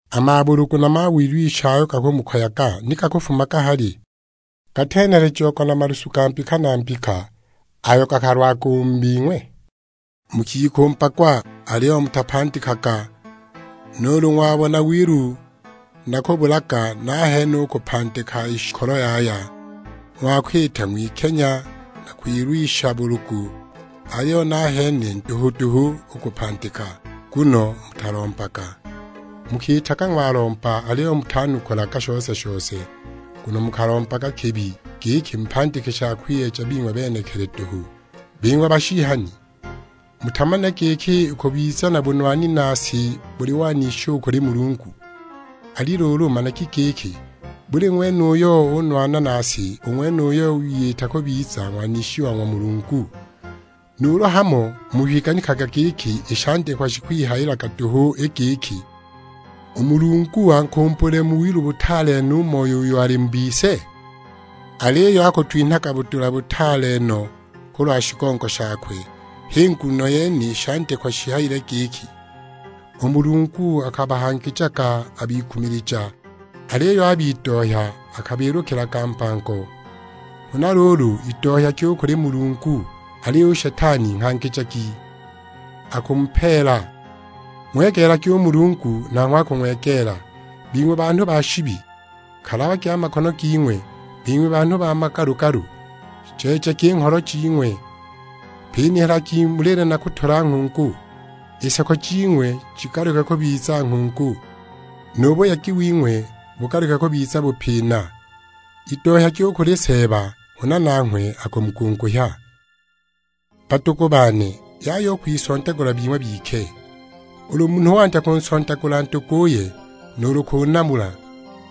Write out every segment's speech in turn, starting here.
A mabulugu na a mawilwisha ayo gakumukoyaga, ni gakufumaga hali? Gatenhelejiagwa na malusu ga mbika na mbika ayo gakalwaga u mu bing'we? Mukikumbagwa, aliyo mutapandikaga; nuulu ng'wabona wilu na kubulaga, nahene u kupandika i shikolo yaya! Ng'wakwita ng'wikenya na kwilwisha bulugu, aliyo nahene nduhu duhu u kupandika, nguno mutalombaga! Mukiitaga ng'walomba aliyo mutanukulaga shose-shose, nguno mukalombaga kibi, giki mupandike sha kwiyeja bing'we benekili duhu! Bing'we bashihani, mutamanile giki u kubiza na bunwani na si buli wanishi u kuli Mulungu? Ali luulu managi giki, buli ng'wene uyo unwana na si, u ng'wenuyo wiyitaga kubiza ng'wanishi wa ng'wa Mulungu! Nuulu hamo mukwiganikaga i shandikwa shikwihayilaga duhu i giki, "U Mulungu ankumbulile mu wilu butaale no u Moyo uyo ali mu bise?" Aliyo akutwinhaga budula butaale no kulwa shigongo shakwe, h'i nguno yene i shandikwa shihayile giki, "U Mulungu akabahangijaga a bikumilija, aliyo a bidohya akabiilukilaga mbango." Huna luulu idohyagi u kuli Mulungu, aliyo u Shetani nghangijagi, akumupeela. Ng'wegeelagi u Mulungu, nanghwe akung'wegeela. Bing'we banhu ba shibi, kalabagi a makono ging'we; bing'we banhu ba magalu-galu, jeejagi i ngholo jing'we. Pinihalagi mulile na kutula nghungu, i seko jing'we jigaluke kubiza nghungu, nu buyegi wing'we bugaluke kubiza bupina. Idohyagi u kuli Seeba, huna nanghwe akumugunguhya. Badugu bane, yaya u kwisondagula bing'we bike. Ulu munhu wandya kunsondagula nduguye nuulu kunamula,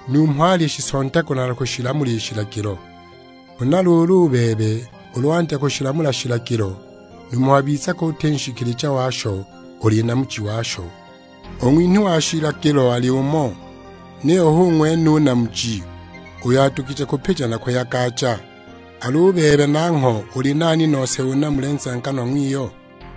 numho alishisondagula na kushilamula shilagilo. Huna luulu, u bebe ulu wandya kushilamula shilagilo, numho wabizaga uti nshikilija washo, uli namuji washo. U ng'winhi wa shilagilo ali umo, niyo hu ng'wene u Namuji, uyo adugije kupija na kuyagaja. Al'u bebe nangho uli nani nose unamule nzenganwa ng'wiyo?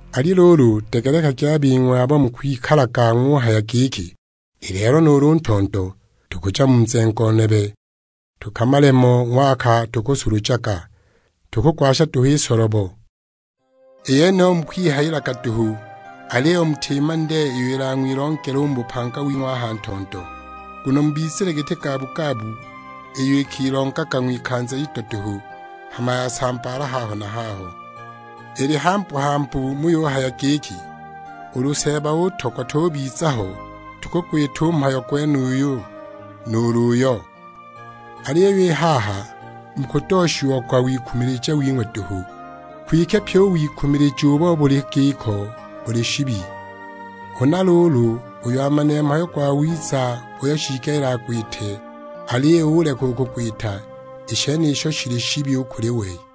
Ali luulu degelekagi a bing'we abo mukwikalaga ng'uhaya giki, "I lelo nuulu ntondo tukuja mu nzengo nebe tukamale mo ng'waka tukusulujaga, tukugwasha duhu i solobo!" I yeniyo mukwihayilaga duhu, aliyo mutimanile iyo ilang'wilongele u mu bupanga wing'we a ha ntondo. Nguno mubizile giti gabugabu, iyo ikilongaga ng'wikanza ido duhu, hama yasambaala haho na haho! Ili hambu-hambu muyuhaya giki, "Ulu Seeba utogwa tubiza ho, tukugwita u mhayo gwenuyu, nuulu uyo." Aliyo i haha mukudooshiagwa wikumilija wing'we duhu; kwike pyi u wikumilija ubo buli giko buli shibi. Huna luulu uyo amanile mhayo gwawiza uyo shiigelile agwite aliyo uleka u kugwita, i shenisho shili shibi u kuli we!